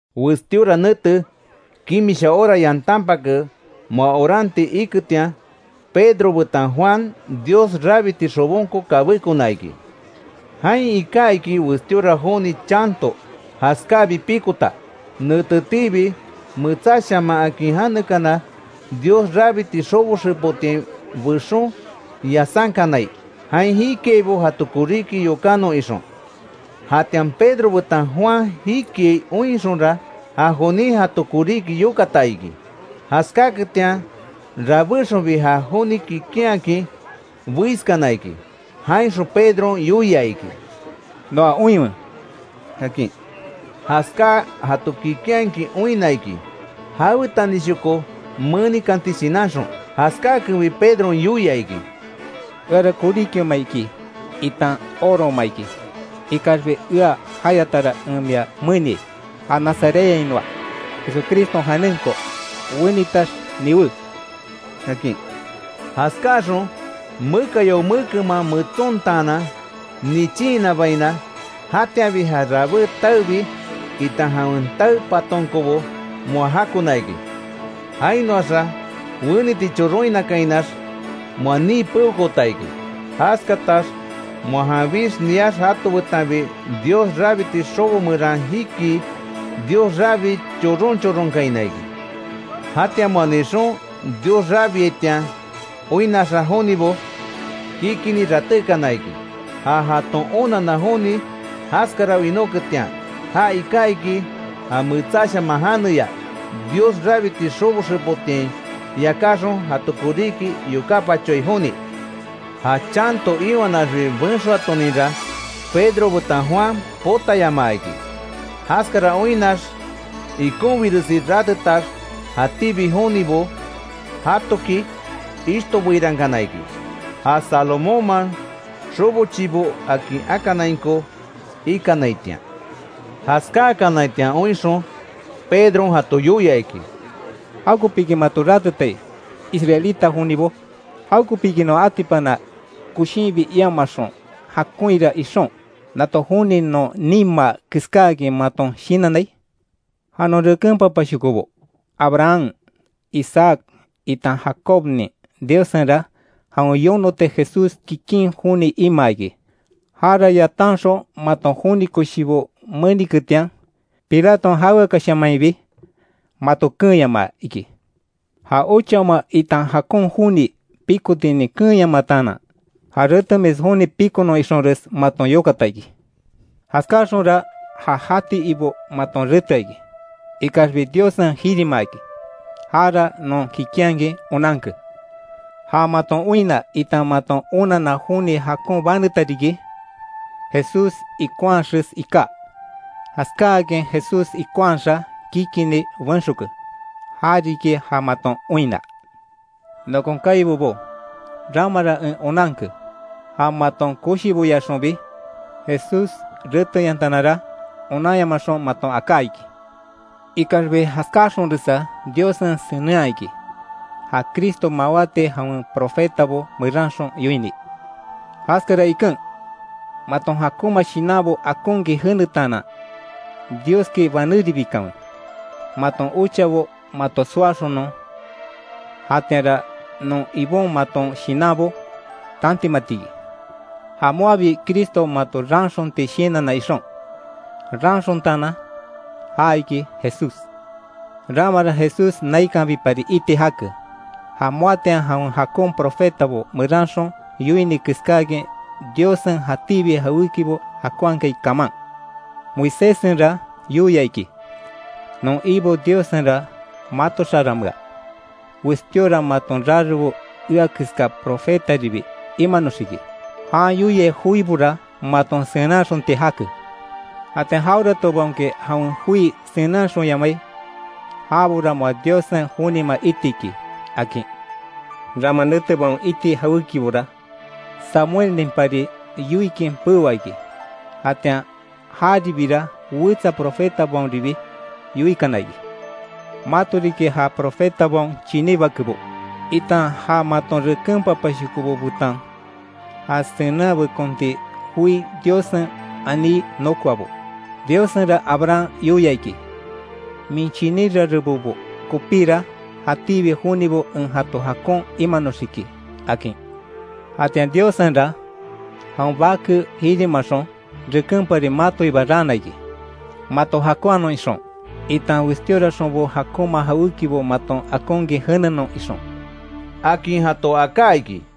Westíora nete, kimisha hora yantanpake, moa oranti iketian, Pedro betan Juan Dios rabiti xobonko kabékona iki. Jain iká iki westíora joni chanto jaskábi pikota. Netetiibi, Metsáshaman akin janekana Dios rabiti xobo xepotiain bexon yasánkanai, jain jikiaibo jato koríki yokánon ixon. Jatian Pedro betan Juan jikiai oinxonra, ja jonin jato koríki yokata iki. Jaskáketian rabéxonbi, ja joni kikinhakin beiskana iki, jainxon Pedron yoia iki: —Noa oinwe —akin. Jaskáa jato kikinhakin oinna iki, jawetanishoko menikanti shinanxon. Jaskákenbi Pedron yoia iki: —Eara koríkioma iki itan orooma iki, ikaxbi ea jayatara en mia meniai, ja Nazarethainoa Jesucriston janenko, ¡Wenitax niwé! —akin. Jaskáaxon mekayao mekenman metsontaanan nichinhinabaina, jatianbi ja rabé taebi itan jawen tae patonkobo moa jakona iki. Jainoaxa weniti choronhinakainax, moa nii peokoota iki. Jaskatax moa janbix niax jato betanbi Dios rabiti xobo meran jikii, Dios rabii choron choronkaina iki. Jatian moa nixon, Dios rabiaitian oinnaxa jonibo, kikinni ratékana iki, ja jaton onanna joni jaskara winóketian. Ja iká iki, ja metsáshaman janeya Dios rabiti xobo xepotiain yakáxon, jato koríki yokápachoai joni. Ja chanto iwanaxbi benxoatoninra, Pedro betan Juan potayamaa iki; jaskara oinnax ikonbiresi ratetax, jatíbi jonibo jatoki ishtobeirankana iki ja Salomónman xobo chibó akin akanainko ikanaitian. Jaskákanaitian oinxon, Pedron jato yoia iki: “¿Jawekopiki mato ratetai, Israelita jonibo? ¿Jawekopiki non atipana koshinbi iamaxon jakonhira ixon, nato joni non nimaa keskáakin maton shinannai? Ja non reken papashokobo, Abraham, Isaac itan Jacobnin Diossenra jawen yonoti Jesús kikin joni imaa iki, jara yatanxon maton joni koshibo meniketian, Pilaton jaweakashamainbi mato keenyamaa iki. Ja ochaoma itan jakon joni pikotinin keenyamataanan, ja retemis joni pikonon ixonres maton yokata iki. Jaskáaxonra ja jati Ibo maton retea iki, ikaxbi Diossen jirimaa iki, jara non kikinhakin onanke. Ja maton oinna, itan maton onanna joni jakon baneta riki, Jesús ikonhaxes iká. Jaskáakin Jesús ikonhaxa kikinni benxoke. Jariki ja maton oinna. Nokon kaibobo, ramara en onanke, ja maton koshiboyaxonbi Jesús reteyantanara, onanyamaxon maton aká iki. Ikaxbi jaskáaxonresa Diossen senenhaa iki, ja Cristo mawáti jawen profetabo meranxon yoini. Jaskara iken, maton jakonma shinanbo akonkin jenetaanan, Dioski banéribikanwe, maton ochabo mato soaxonon, jatianra non Ibon maton shinanbo tantimati iki, ja moabi Cristo mato raanxonti shinanna ixon, raanxontaanan, ja iki Jesús. Ramara Jesús naikanbipari iti jake, ja moatian jawen jakon profetabo meranxon yoini keskáakin Diossen jatíbi jawékibo jakonhakai kaman. Moiséssenra yoia iki: ‘Non Ibo Diossenra mato xaranmea, westíora maton rarebo ea keská profetaribi imanoxiki. Jan yoiai joibora maton senenhaxonti jake. Jatian jaweratobaonki jawen joi senenhaxonyamai, jabora moa Diossen jonima iti iki’, akin. Rama netebaon iti jawékibora, Samuelninpari yoikin peoa iki. Jatian jaribira wetsa profetabaonribi yoikana iki. Mato riki ja profetabaon chiní bakebo, itan ja maton reken papashokobo betan ja senenhabekonti joi Diossen aní nokoabo. Diossenra Abraham yoia iki: ‘Min chiní rarebobo kopíra, jatíbi jonibo en jato jakon imanoxiki’, akin. Jatian Diossenra jawen Bake jirimaxon, rekénpari matoiba raana iki, mato jakonhanon ixon, itan westioraxonbo jakonma jawékibo maton akonkin jenenon ixon”, akin jato aká iki.